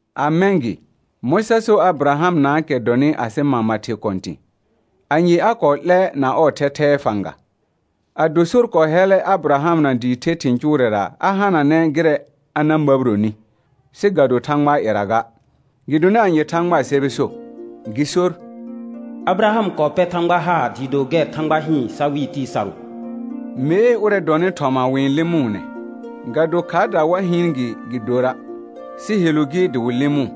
A mɛ̃ gɩ, mɔ̃ sa so Abɩrahamnaakɛ dɔnɩ asɩ mama thɩ kɔ̃tɩ̃? Anye a kɔɔ 'lɛ na ɔɔ thɛthɛɛ fãga? Ado sor kɔɔ hɛllɛ Abɩrahamna dɩɩ the thɩ̃ cʋʋrɛra a hananɛ gɩrɛ a na məbironi, sɩ ga do Thãgbaa ƴɛra ga. Gɩdonɩ anye Thãgbaa sɛbɛ so? Gɩ sor: «Abɩraham kɔɔ pɛr Thãgba haar dɩɩ do gɛr Thãgba hɩɩn sa wɩɩ tɩɩ sarʋ.» Mee ʋrɛ dɔnɩ thɔma wɩ-n lɩmʋʋnɛ, ga do khaardaa wa hɩɩn gɩ gɩ dora', sɩ helu gɩ dɩ wɩ lɩmʋʋ.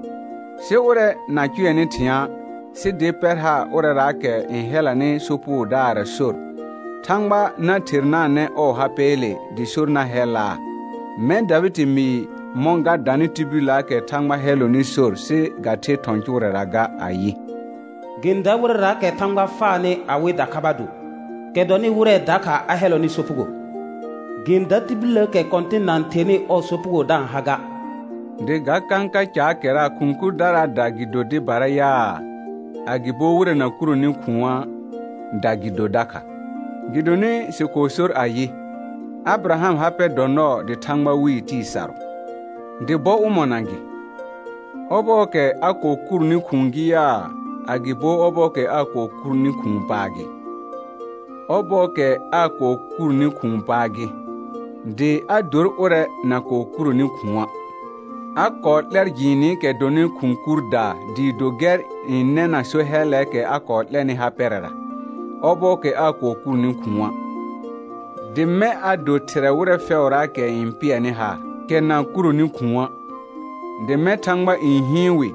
Sɩ ʋrɛ na-n cʋɛnɩ thɩ̃a', sɩ dɩ pɛr haar ʋrɛraakɛ n hɛlanɩ sopugodaarra sor, Thãgba na thernanɛ ɔɔ ha pɛɛle dɩ sor na hɛllaa. Mɛ̃ Davɩdɩ mɩɩ mɔ̃ ga danɩ tibilləəkɛ Thãgba n hɛllɔnɩ sor sɩ ga-n the thɔ̃ cʋʋrɛra ga, ayɩ: «Gɩ-n dar wɩrɛraakɛ Thãgba faanɩ awɩ dakhaba do, kɛ dɔnɩ wɩrɛ dakha a hɛllɔnɩ sopugo. Gɩ-n dar tibilləəkɛ Kɔ̃tɩn na-n thernɩ ɔɔ sopugo da-n ha ga.» Dɩ ga kãka caakɛra khʋ̃ kurdaraada gɩ do dɩbara yaa, agɩbo wɩrɛ na kuroni khʋ̃aada gɩ do dakha? Gɩdonɩ sɩ kɔɔ sor ayɩ: «Abɩrahamɩ ha pɛ dɔ nɔɔ dɩ Thãgba wɩɩ tɩɩ sarʋ.» Dɩ bɔ ʋmɔna gɩ? Ɔbɔɔkɛ a kɔɔ kurni khʋ̃ʋ gɩ yaa, agɩbo ɔbɔɔkɛ aa kɔɔ kurni khʋ̃ʋ paa gɩ? Ɔbɔɔkɛ aa kɔɔ kurni khʋ̃ʋ paa gɩ, dɩ a dor ʋrɛ na kɔɔ kuroni khʋ̃a'. A kɔɔ 'lɛr jɩɩnɩkɛ dɔnɩ khʋ̃ kurdaa dɩɩ do gɛr n nɛna so hɛllɛɛkɛ a kɔɔ 'lɛnɩ ha pɛrɛra, ɔbɔɔkɛ aa kɔɔ kurni khʋ̃a'; dɩ mɛ̃ a do thɩrɛ wɩrɛ fɛʋraakɛ n pɩɛrnɩ haar, kɛ na kuroni khʋ̃a', dɩ mɛ̃ Thãgba n hɩɩn wɩ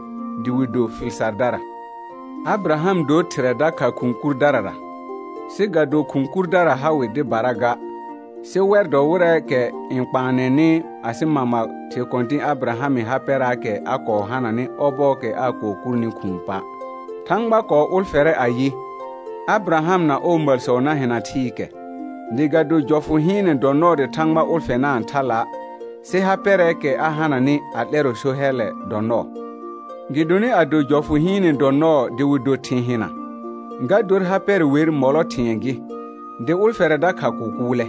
dɩ wɩ do fɩl sardara. Abɩraham dor thɩrɛ dakha khʋ̃ kurdarara, sɩ ga do khʋ̃ kurdara ha wɩ dɩbara ga, sɩ wɛr dɔ wɩrɛɛkɛ n kpaannɩ asɩ mama thɩ kɔ̃tɩ̃ Abɩrahamɩ ha pɛraakɛ a kɔɔ hananɩ ɔbɔɔkɛ aa kɔɔ kurni khʋ̃ʋ pa'. Thãgba kɔɔ ʋlfɛrɛ ayɩ, Abɩraham na ɔɔ məlsɔ na hɩna thɩɩkɛ; dɩ ga do jɔfʋ hɩɩnɛ dɔ nɔɔ dɩ Thãgba ʋlfɛnaa thala', sɩ ha pɛrɛɛkɛ a hananɩ a 'lɛrɔ so hɛllɛ dɔ nɔɔ. Gɩdonɩ ado jɔfʋ hɩɩnɛ dɔ nɔɔ dɩ wɩ do thɩ̃ hɩna, ga dor ha pɛrɛ wer mɔlɔ thɩ̃ɛ gɩ, dɩ ʋlfɛrɛ dakha kʋkʋʋlɛ.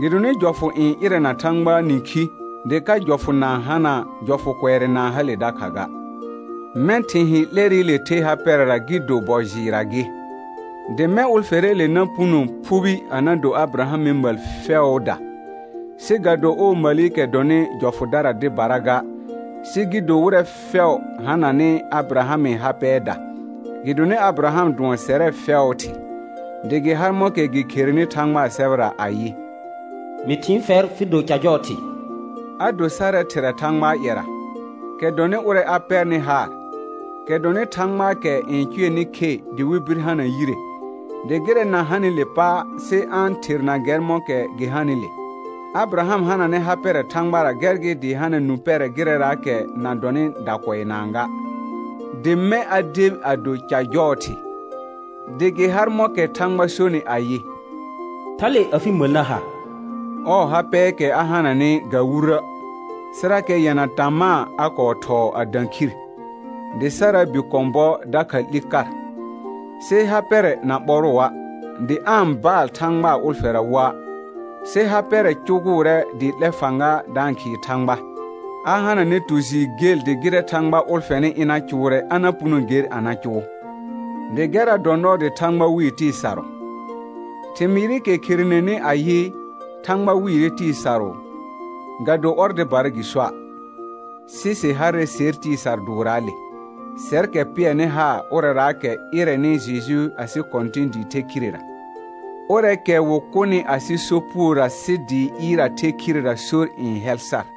Gɩdonɩ jɔfʋ n ɩrɛna Thãgbaa nĩkhi, dɩ ka jɔfʋ na-n hana', jɔfʋ kʋɛrɛ na-n hale dakha ga. Mɛ̃ thɩ̃ hɩ̃ 'lɛrɩle the ha pɛrɛra gɩ do bɔ jɩɩrra gɩ, dɩ mɛ̃ ʋlfɛrɛɛle na puno phubi a na do Abɩrahamɩ məl fɛʋʋda, sɩ ga do ɔɔ məlikɛ dɔnɩ jɔfʋdara dɩbara ga, sɩ gɩ do wɩrɛ fɛʋ hananɩ Abɩrahamɩ ha pɛɛda; gɩdonɩ Abɩraham dʋɔn sɛrɛ fɛʋʋ thɩ. Dɩ gɩ har mɔ̃kɛ gɩ kherenɩ Thãgbaa sɛbɛra ayɩ: «Mɩ thɩɩn fɛr fɩ do ca jɔɔ thɩ.» A do sarɛ thɩrɛ Thãgbaa ƴɛra, kɛ dɔnɩ ʋrɛ a pɛrnɩ haar, kɛ dɔnɩ Thãgbaakɛ n cʋɛnɩ khe dɩ wɩ bir hana yire, dɩ gɩrɛ na hanɩle pa' sɩ a-n therna gɛr mɔ̃kɛ gɩ hanɩle. Abɩraham hananɛ ha pɛrɛ Thãgbara gɛr gɩ dɩ hana nũ pɛrɛ gɩrɛraakɛ na dɔnɩ dacʋʋnaa ga, dɩ mɛ̃ a debi a do «ca jɔɔ thɩ», dɩ gɩ har mɔ̃kɛ Thãgba sonɩ ayɩ: «Thale afɩ məl na ha.» Ɔɔ ha pɛɛkɛ a hananɩ ga wurə', sɩrakɛ yɛna tamaa a kɔɔ thɔɔ a dã khir, dɩ Saraa bi kɔ̃ bɔ dakha 'li kar. Sɩ ha pɛrɛ na ɓɔrʋa', dɩ aa-n baal Thãgbaa ʋlfɛra woa', sɩ ha pɛrɛ cʋgʋʋrɛ dɩ 'lɛ fãga da-n khɩɩ Thãgba. A hananɛ tu jɩɩr gel dɩ gɩrɛ Thãgba ʋlfɛnɩ ɩna cʋʋrɛ a na puno ger a na cʋʋ; dɩ gɛrra dɔ nɔɔ dɩ «Thãgba wɩɩ tɩɩ sarʋ.» Thɩmɩɩrɩkɛ kherenenɩ ayɩ, «Thãgba wɩɩrɛ tɩɩ sarʋ», ga do ɔr dɩbara gɩ soa'. Sɩ sɩ harrɛ ser tɩɩ sar dʋʋrraale, sɛrkɛ pɩɛrnɩ haar ʋrɛraakɛ ɩrɛnɩ Jeju asɩ Kɔ̃tɩ̃ dɩ the khirera. Ʋrɛɛkɛ wɩ kʋnɩ asɩ sopugora sɩ dɩ ɩɩr a the khirera sor n hɛl sar.